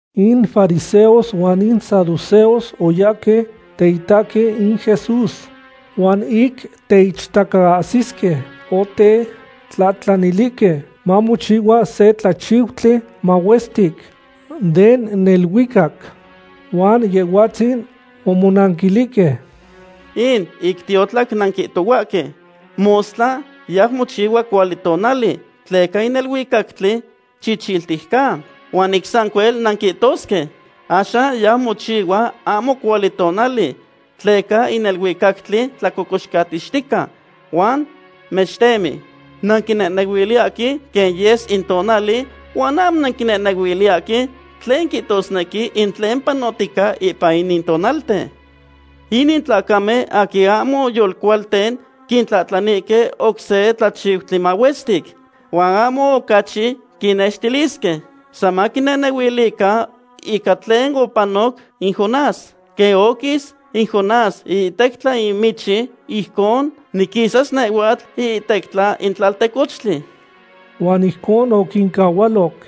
In fariseos huan in saduceos oyahque teitahque in Jesús. Huan ic teichtacaahsisque, otetlahtlanilihque mamochihua se tlachiutli mahuestic den neluicac. Huan Yehhuatzin omonanquilihque: ―In ic tiotlac nanquihtohuaque: “Mostla yau mochihua cuali tonali, tleca in neluicactli chichiltic ca.” Huan ic sancuel nanquihtosque: “Axan yau mochihua ahmo cuali tonali, tleca in neluicactli tlacocoxcatixtica huan mextemi.” Nanquinehnehuiliyahque quen yes in tonali huan ahmo nanquixnehnehuiliyahque tlen quihtosnequi in tlen panohtica ipan inin tonalten. Inin tlacamen aquin ahmo yolcualten quitlahtlanihque oc se tlachiutli mahuestic. Huan ahmo ocachi quinnextilisque. San maquinehnehuilican ica tlen opanoc in Jonás. Quen oquis in Jonás iihtectla in michi, ijcon niquisas nehhuatl iihtectla in tlaltecochtli. Huan ijcon oquincahualoc.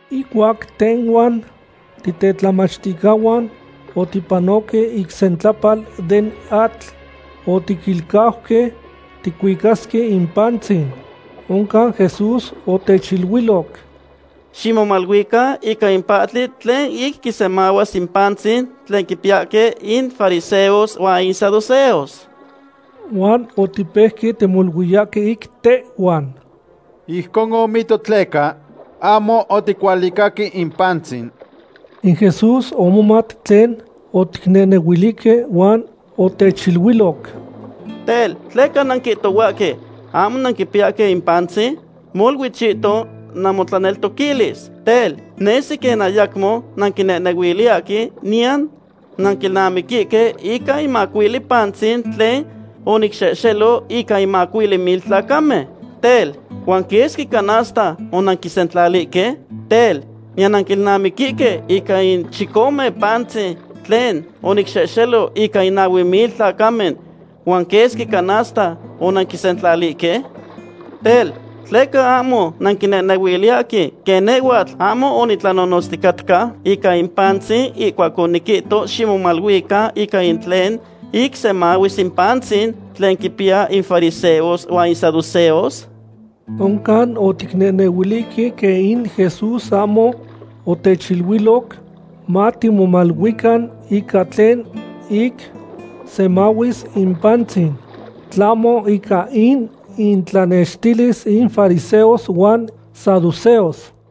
Ihcuac tehhuan titetlamachticahuan otipanoque ic sentlapal den atl, otiquilcauque ticuicasque in pantzin. Oncan Jesús otechiluiloc: ―Ximomaluican ica in pahtli tlen ic semahuis in pantzin tlen quipiyahque in fariseos huan in saduceos. Huan otipeuque timoluiyahque ic tehhuan: ―Ijcon omihto tleca ahmo oticualicaque in pantzin. In Jesús omomat tlen oticnehnehuilihque huan otechiluiloc: ―Tel, ¿tleca nanquihtohuahque ahmo nanquipiyahque in pantzin? Molui chihton namotlaneltoquilis. Tel, nesi quen ayamo nanquinehnehuiliyahque niyan nanquilnamiquihque ica in macuili pantzin tlen onicxehxelo ica in macuili mil tlacamen. Tel, ¿huan quesqui canasta onanquisentlalihque? Tel, ¿niyan nanquilnamiquihque ica in chicome pantzin tlen onicxehxelo ica in nahue mil tlacamen, huan quesqui canasta onanquisentlalihque? Tel, ¿tleca ahmo nanquinehnehuiliyahque quen nehhuatl ahmo onitlanonotzticatca ica in pantzin ihcuac oniquihto ximomaluican ica in tlen ic semahuis in pantzin tlen quipiyahque in fariseos huan in saduceos? Oncan oticnehnehuilihque quen in Jesús ahmo otechiluiloc matimomaluican ica tlen ic semahuis in pantzin, tlahmo ica in intlanextilis in fariseos huan saduceos.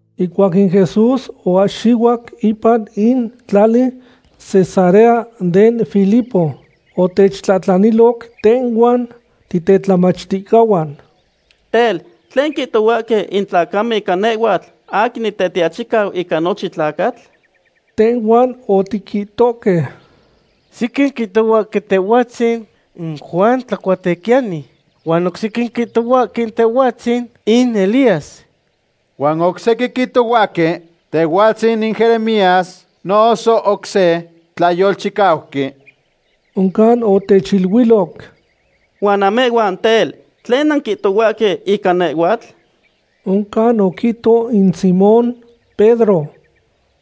Ihcuac in Jesús oahxihuac ipan in tlali Cesarea den Filipo, otechtlahtlaniloc tehhuan titetlamachticahuan: ―Tel, ¿tlen quihtohuahque in tlacamen ica nehhuatl aquin Nitetiachicau ica nochin tlacatl? Tehhuan otiquihtohque: ―Sequin quihtohuahque Tehhuatzin in Juan Tlacuatequiyani, huan oc sequin quihtohuahque Tehhuatzin in Elías, huan oc sequin quihtohuahque Tehhuatzin in Jeremías noso oc se tlayolchicauqui. Oncan otechiluiloc: ―Huan namehhuan, tel, ¿tlen nanquihtohuahque ica nehhuatl? Oncan oquihto in Simón Pedro: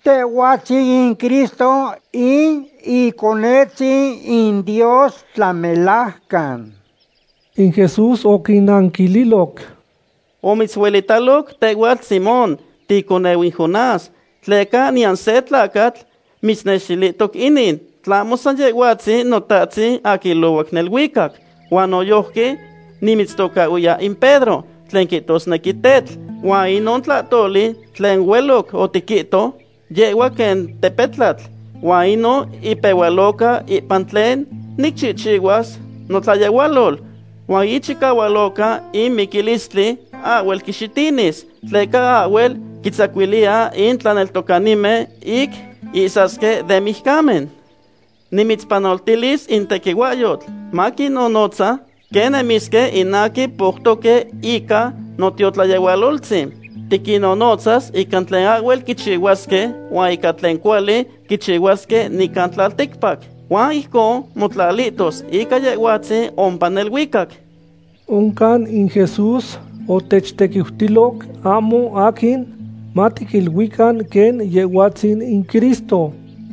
―Tehhuatzin in Cristo, in Iconetzin in Dios tlamelajcan. In Jesús oquinanquililoc: ―Omitzuelitaloc tehhuatl Simón, ticoneu in Jonás, tleca niyan se tlacatl mitznextilihtoc inin, tlahmo san Yehhuatzin Notahtzin aquin ilohuac neluicac. Huan noyojqui nimitztocahhuiya in Pedro, tlen quihtosnequi tetl, huan inon tlahtoli tlen hueloc otiquihto, yehhua quen tepetlatl. Huan inon ipehualoca ipan tlen nicchihchihuas notlayehualol. Huan ichicahualoca in miquilistli ahhuel quixitinis, tleca ahhuel quintzacuiliya in tlaneltocanimen ic ihsasque den mijcamen. Nimitzpanoltilis in tequihuahyotl maquinnonotza quen nemisque in aquin poutoque ica notiotlayehualoltzin. Tiquinnonotzas ica tlen ahhuel quichihuasque huan ica tlen cuali quichihuasque nican tlalticpac. Huan ijconon motlalihtos ica Yehhuatzin ompa neluicac. Oncan in Jesús otechtequiutiloc ahmo aquin matiquiluican quen Yehhuatzin in Cristo.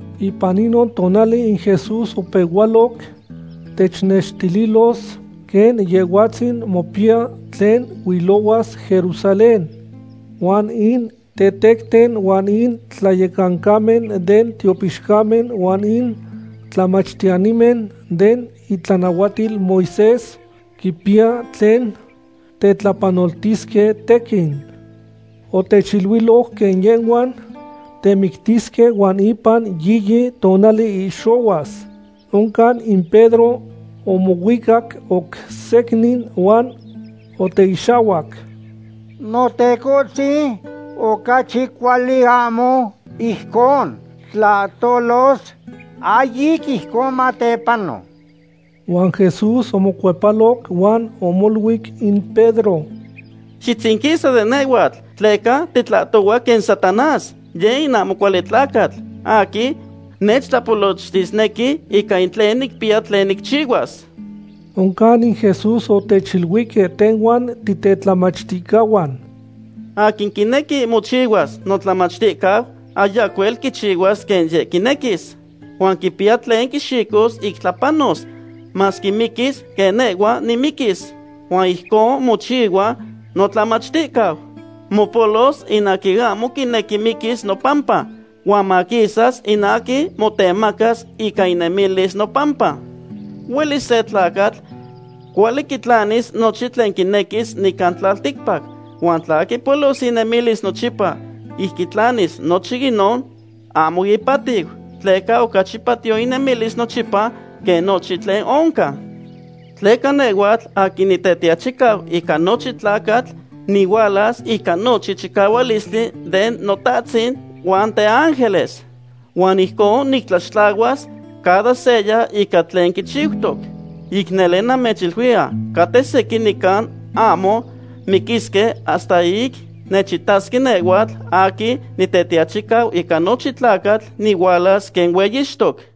Ipan inon tonali in Jesús opehualoc technextililos quen Yehhuatzin mopiya tlen huilohuas Jerusalén. Huan in tetecten huan in tlayecancamen den tiopixcamen huan in tlamachtiyanimen den itlanahuatil Moisés quipiya tlen tetlapanoltisque tequin. Otechiluiloc quen yehhuan temictisque huan ipan yiyi tonali ihxohuas. Oncan in Pedro omohuicac oc secnin huan oteixahhuac: ―¡Notecohtzin, ocachi cuali ahmo ijcon tlahtolos! ¡Ahyic ijcon matepano! Huan Jesús omocuepaloc huan omoluic in Pedro: ―¡Xitzinquisa de nehhuatl tleca titlahtohua quen Satanás! Yeh in ahmo cuali tlacatl, aquin nechtlapolochtisnequi ica in tlen nicpiya tlen nicchihuas. Oncan in Jesús otechiluihque tehhuan titetlamachticahuan: ―Aquin quinequi mochihua notlamachticau ayacuel quichihuas quen yeh quinequis. Huan quipiya tlen quixicos ic tlapanos, masque miquis quen nehhua nimiquis, huan ijcon mochihua notlamachticau. Mopolos in aquin ahmo quinequi miquis nopampa, huan maquisas in aquin motemacas ica inemilis nopampa. Huelis se tlacatl cuali quitlanis nochin tlen quinequis nican tlalticpac. Huan tla quipolos inemilis nochipa ic quitlanis nochin inon, ahmo ipahtiu. Tleca ocachi patiyo inemilis nochipa quen nochin tlen oncan. Tleca nehhuatl aquin Nitetiachicau ica nochin tlacatl nihualas ica nochin chicahualistli den Notahtzin ihuan teángeles. Huan ijcon nictlaxtlahuas cada seya ica tlen quichiutoc. Ic nele namechiluiya, caten sequin nican ahmo miquisque hasta ic nechitasque nehhuatl aquin Nitetiachicau ica nochin tlacatl nihualas quen hueyixtoc.